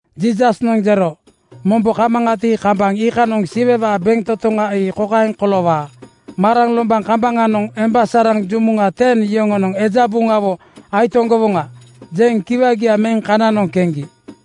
Jiisasnoŋ jero, “Mombo kamaŋati, kambaŋ iikanoŋ Siwewaa bentotoŋa ii kokaeŋ koloowaa: Maraŋ lombaŋ kambaŋanoŋ emba saraŋ jumuŋa ten yoŋonoŋ ‘Eja buŋawo aitoŋgowoŋa,’ jeŋ kiwagia meŋ kananoŋ keŋgi.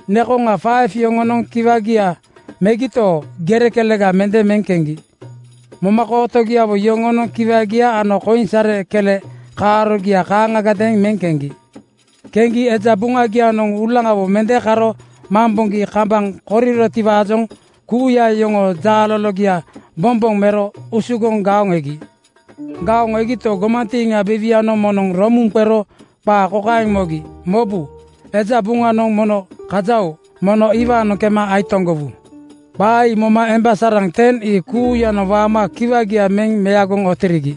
Nekoŋa yoŋonoŋ kiwagia megito, gere (koinsare) kelega mende meŋ keŋgi. Momakootogiawo yoŋonoŋ kiwagia ano koinsare kele kaarogia kaaŋagadeeŋ meŋ keŋgi. Keŋgi eja buŋanoŋ uulaŋawo mende karo mamboŋgi kambaŋ korirotiwaajoŋ kuuya yoŋoo jaalologia bomboŋ mero usugoŋ gaoŋ egi. “Gaoŋ egito, gomantiiŋa biiwianoŋ moŋnoŋ romuŋ qero qa kokaeŋ mogi, ‘Mobu, eja buŋanoŋ mono kaja-oo! Mono iwaanoŋ kema aitoŋgowu.’ Qa ii moma emba saraŋ ten ii kuuyanoŋ waama kiwagia meŋ meagoŋ ootirigi.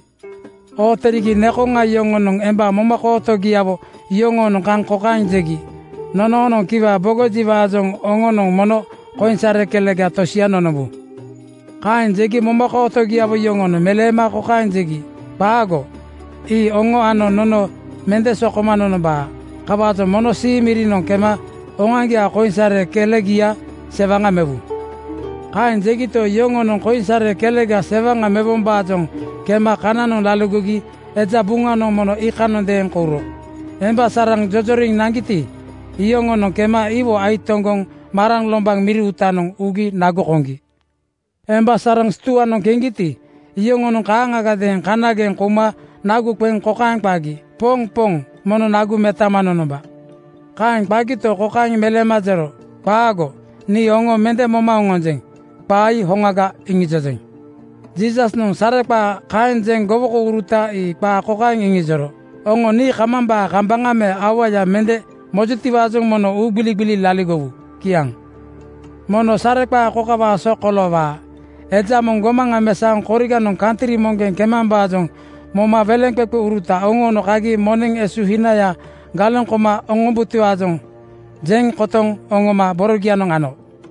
Ootirigi nekoŋa yoŋonoŋ emba momokootogiawo yoŋoonoŋ kaŋ kokaeŋ jegi, ‘Nonoonoŋ kiwa bogojiwaajoŋ oŋonoŋ mono koinsare kelega tosia nonombu.’ “Kaeŋ jegi momakootogiawo yoŋonoŋ meleema kokaeŋ jegi, ‘Qaago! Ii oŋo ano nono mende sokoma nonombaa. Kawaajoŋ mono sii mirinoŋ kema oŋoaŋgiaa koinsare kelegia sewaŋa mewu.’ “Kaeŋ jegito, yoŋonoŋ koinsare kelega sewaŋa mewombaajoŋ kema kananoŋ laligogi eja buŋanoŋ mono iikanondeeŋ kouro. Emba saraŋ jojoriŋ naŋgiti, iyoŋonoŋ kema iwo aitoŋgoŋ maraŋ lombaŋ miri uutanoŋ ugi nagu koŋgi. Emba saraŋ stuanoŋ keŋgiti, iyoŋonoŋ kaaŋagadeeŋ kanageŋ kouma nagu qeŋ kokaeŋ qagi, ‘Poŋ Poŋ, mono nagu metaama nonomba!’ “Kaeŋ qagito, kokaeŋ meleema jero, ‘Qaago! Nii oŋo mende moma oŋonjeŋ. Qaa ii hoŋaga iŋijojeŋ.’ Jiisasnoŋ sareqaa kaeŋ jeŋ gowokouruta ii qaa kokaeŋ iŋijoro, “Oŋo nii kamambaa kambaŋa me auaya mende mojutiwaajoŋ mono uugbiligbili laligowu.” Kiaŋ. “Mono sareqaa kokawaa so koloowaa: Eja moŋ gomaŋa mesaoŋ koriganoŋ kantri moŋgeŋ kemambaajoŋ moma weleŋqeqeuruta oŋoono kagi moneŋ esuhinaya galeŋ koma oŋombutiwaajoŋ jeŋ kotoŋ oŋoma borogianoŋ ano.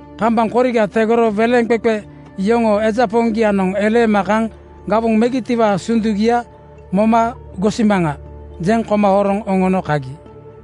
Kambaŋ koriga tegoro weleŋqeqe yoŋoo eja poŋgianoŋ eleema kaŋ ‘Gawoŋ megitiwaa sundugia moma gosimaŋa,’ jeŋ koma horoŋ oŋono kagi.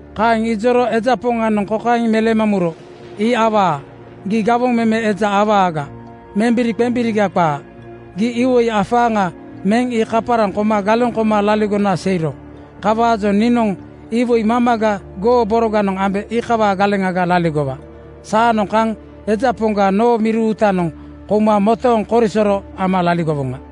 “Kaeŋ ijoro eja poŋanoŋ kokaeŋ meleema muro, ‘Ii awaa. Gii gawoŋ meme eja awaga membiri-qembiriga qaa. Gii iwoi afaaŋa meŋ ii kaparaŋ koma galeŋ koma laligona seiro. Kawaajoŋ niinoŋ iwoi mamaga goo boroganoŋ ambe iikawaa galeŋaga laligowa. Saanoŋ kaŋ eja poŋga noo miri uutanoŋ kouma motooŋ korisoro ama laligowoŋa.’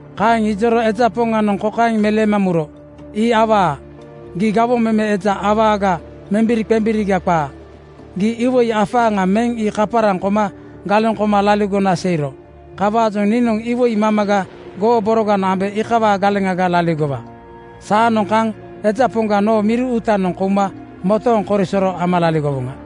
“Kaeŋ ijoro eja poŋanoŋ kokaeŋ meleema muro, ‘Ii awaa. Gii gawoŋ meme eja awaga membiri-qembiriga qaa. Gii iwoi afaaŋa meŋ ii kaparaŋ koma galeŋ koma laligona seiro. Kawaajoŋ niinoŋ iwoi mamaga goo boroganoŋ ambe iikawaa galeŋaga laligowa. Saanoŋ kaŋ eja poŋga noo miri uutanoŋ kouma motooŋ korisoro ama laligowoŋa.’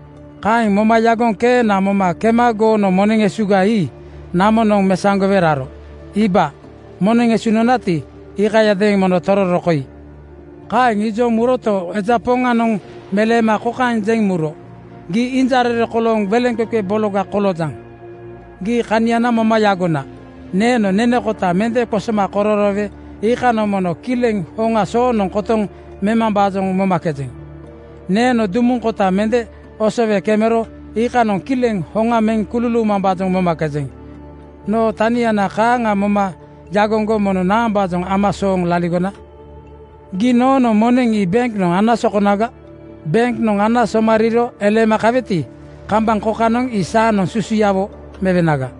“Kaeŋ moma yagoŋ keena moma kema goo moneŋ esuga ii namonoŋ mesaŋgowe ero. Iiba, moneŋ esu nonati, iikayadeeŋ mono tororo koi.’ Kaeŋ ijoŋ ii muroto, eja poŋanoŋ meleema kokaeŋ jeŋ muro, ‘Gii injarere kolooŋ weleŋqeqe bologa koloojaŋ! Gii kaniana moma yagona: Neeno nene kota mende qosoma kororoowe iikanoŋ mono kileŋ hoŋa soonoŋ kotoŋ memambaajoŋ momakejeŋ. Neeno dumuŋ kota mende osowe kemero iikanoŋ kileŋ hoŋa meŋ kululuumambaajoŋ momakejeŋ. Noo tanina kaaŋa moma yagoŋgo mono naambaajoŋ ama sooŋ laligona? “Gii noonoŋ moneŋ ii benknoŋ ana sokonaga. Benknoŋ ana somariiro eleema kaweti, kambaŋ kokanoŋ ii saanoŋ susuyawo mewenaga.’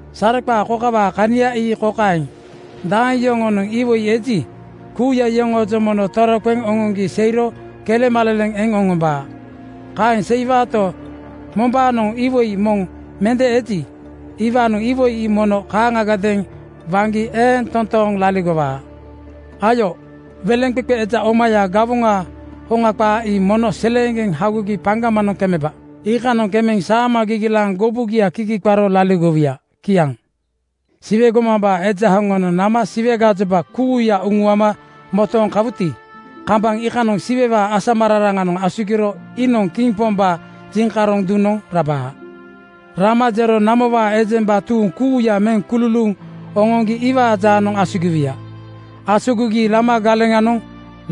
“Sareqaa kokawaa kania ii kokaeŋ: Daeŋ yoŋoonoŋ iwoi eji, kuuya iyoŋoojoŋ mono toroqeŋ oŋoŋgi seiro kelemaleleŋ eŋ oŋombaa. Kaeŋ seiwaato, mombaanoŋ iwoi moŋ mende eji, iwaanoŋ iwoi ii mono kaaŋagadeeŋ waŋgi eeŋ toontooŋ laligowaa. Ayo, weleŋqeqe eja omaya gawoŋaa hoŋa qaa ii mono seleeŋgeŋ hagogi paŋgamanoŋ kemeba. Iikanoŋ kemeŋ saama gigilaaŋ gubugia kigi qaro laligowuya.” Kiaŋ. “Siwe gomambaa Eja hoŋanoŋ nama Siwe gajoba kuuya uŋuama motooŋ kawuti, kambaŋ iikanoŋ Siwewaa asamararaŋanoŋ asugiro iinoŋ Kiŋ Pombaa jiŋkaroŋ duŋnoŋ rabaa. Rama jero namowaa ejemba tuuŋ kuuya meŋ kululuuŋ oŋoŋgi iwaa jaanoŋ asugiwuya. Asugigi lama galeŋanoŋ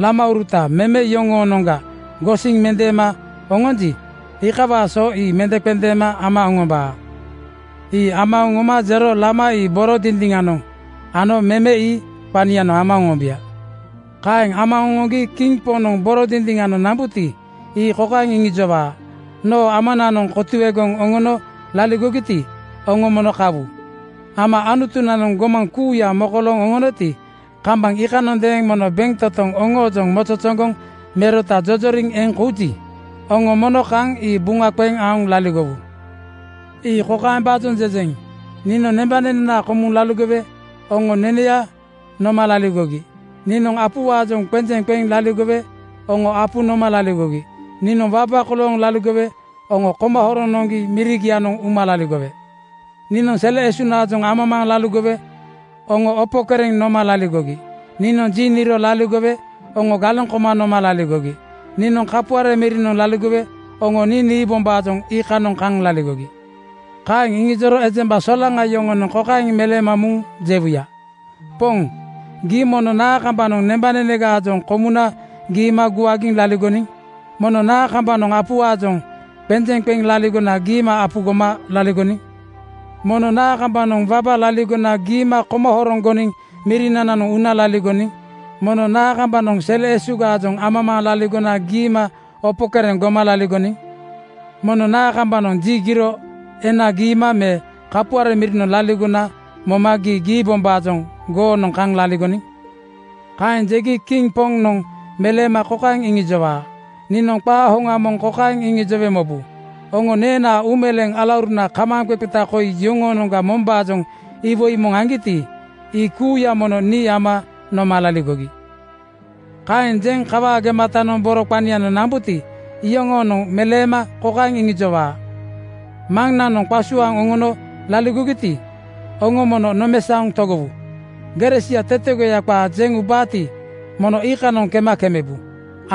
lamauruta meme (noniŋ) yoŋoonoŋga gosiŋ mendeema oŋonji, iikawaa so ii mendeŋqendeeŋ ama oŋombaa. Ii ama oŋoma jero lama ii boro dindiŋanoŋ ano meme (noniŋ) ii qanianoŋ ama oŋombuya. “Kaeŋ ama oŋoŋgi Kiŋ Poŋnoŋ boro dindiŋanoŋ nambuti, ii kokaeŋ iŋijowaa, ‘Noo Amananoŋ kotuegoŋ oŋono laligogiti, oŋo mono kawu. Ama Anutunananoŋ gomaŋ kuuya mokolooŋ oŋonoti, kambaŋ iikanondeeŋ mono bentotoŋ oŋoojoŋ mozozoŋgoŋ merota jojoriŋ eŋ kouji, oŋo mono kaŋ ii buŋa qeŋ aoŋ laligowu. “Ii kokaembaajoŋ jejeŋ: Niinoŋ nembanenenaa komuŋ laligowe oŋo neneya noma laligogi. Niinoŋ apuwaajoŋ qenjeŋ qeŋ laligowe oŋo apu noma laligogi. Niinoŋ waba kolooŋ laligowe oŋo koma horoŋ noŋgi mirigianoŋ uma laligowe. Niinoŋ sele esunaajoŋ amamaaŋ laligowe oŋo opo kereŋ noma laligogi. Niinoŋ ji niro laligowe oŋo galeŋ koma noma laligogi. Niinoŋ kapuare mirinoŋ laligowe oŋo nii niibombaajoŋ iikanoŋ kaŋ laligogi.’ “Kaeŋ iŋijoro ejemba solaŋa yoŋonoŋ kokaeŋ meleema muŋ jewuya, ‘Poŋ, gii mono naa kambanoŋ nembanenegaajoŋ komuna giima guagiŋ laligoniŋ? Mono naa kambanoŋ apuwaajoŋ qenjeŋ qeŋ laligona giima apu goma laligoniŋ? Mono naa kambanoŋ wabaga laligona giima koma horoŋ goniŋ mirinananoŋ una laligoniŋ? Mono naa kambanoŋ sele esugaajoŋ amamaaŋ laligona giima opo kereŋ goma laligoniŋ? “Mono naa kambanoŋ ji giro ena giima me kapuare mirinoŋ laligona moma gii giibombaajoŋ goonoŋ kaŋ laligoniŋ?’ Kaeŋ jegi Kiŋ Poŋnoŋ meleema kokaeŋ iŋijowaa, ‘Niinoŋ qaa hoŋa moŋ kokaeŋ iŋijowe mobu: Oŋo neenaa uumeleeŋ alauruna kamaaŋqeqeta koi yoŋoonoŋga mombaajoŋ iwoi moŋ aŋgiti, ii kuuya mono nii ama noma laligogi.’ “Kaeŋ jeŋ kawaa gematanoŋ boro qanianoŋ nambuti, iyoŋoonoŋ meleema kokaeŋ iŋijowaa, ‘Maŋnanoŋ qasuaaŋ oŋono laligogiti, oŋo mono nomesaoŋ togowu. Gere sia tetegoya qaa jeŋ ubaati, mono iikanoŋ kema kemebu.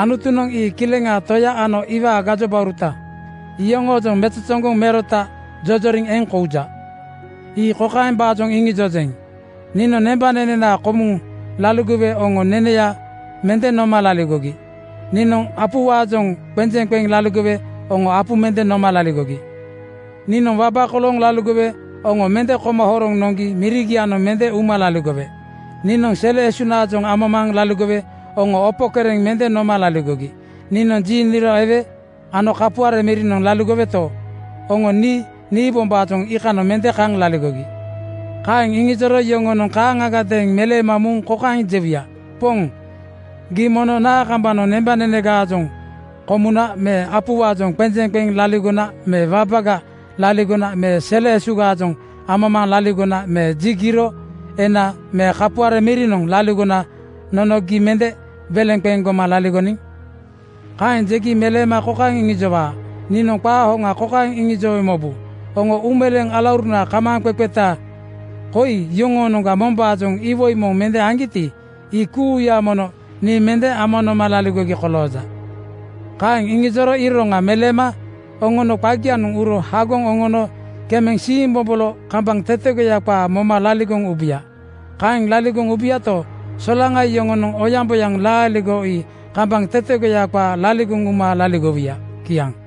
Anutunoŋ ii Kileŋaa Toya ano iwaa gajobauruta yoŋoojoŋ mozozoŋgoŋ merota jojoriŋ eŋ kouja. Ii kokaembaajoŋ iŋijojeŋ: Niinoŋ nembanenenaa komuŋ laligowe oŋo neneya mende noma laligogi. Niinoŋ apuwaajoŋ qenjeŋ qeŋ laligowe oŋo apu mende noma laligogi. “Niinoŋ waba kolooŋ laligowe oŋo mende koma horoŋ noŋgi mirigianoŋ mende uma laligowe. Niinoŋ sele esunaajoŋ amamaaŋ laligowe oŋo opo kereŋ mende noma laligogi. Niinoŋ ji niro ewe ano kapuare mirinoŋ laligoweto, oŋo nii niibombaajoŋ iikanoŋ mende kaŋ laligogi.’ “Kaeŋ iŋijoro yoŋonoŋ kaaŋagadeeŋ meleema muŋ kokaeŋ jewuya, ‘Poŋ, gii mono naa kambanoŋ nembanenegaajoŋ komuna me apuwaajoŋ qenjeŋ qeŋ laligona me wabaga laligona me sele esugaajoŋ amamaaŋ laligona me ji giro ena me kapuare mirinoŋ laligona nono gii mende weleŋ qeŋ goma laligoniŋ?’ “Kaeŋ jegi meleema kokaeŋ iŋijowaa, ‘Niinoŋ qaa hoŋa kokaeŋ iŋijowe mobu: Oŋo uumeleeŋ alauruna kamaaŋqeqeta koi yoŋoonoŋga mombaajoŋ iwoi moŋ mende aŋgiti, ii kuuya mono nii mende ama noma laligogi kolooja.’ “Kaeŋ iŋijoro iroŋa meleema oŋono qagianoŋ uro hagoŋ oŋono kemeŋ siimbobolo kambaŋ tetegoya qaa moma laligoŋ ubuya. Kaeŋ laligoŋ ubuyato, solaŋa yoŋonoŋ oyaŋboyaŋ laaligo ii kambaŋ tetegoya qaa laligoŋ uma laligowuya.” Kiaŋ.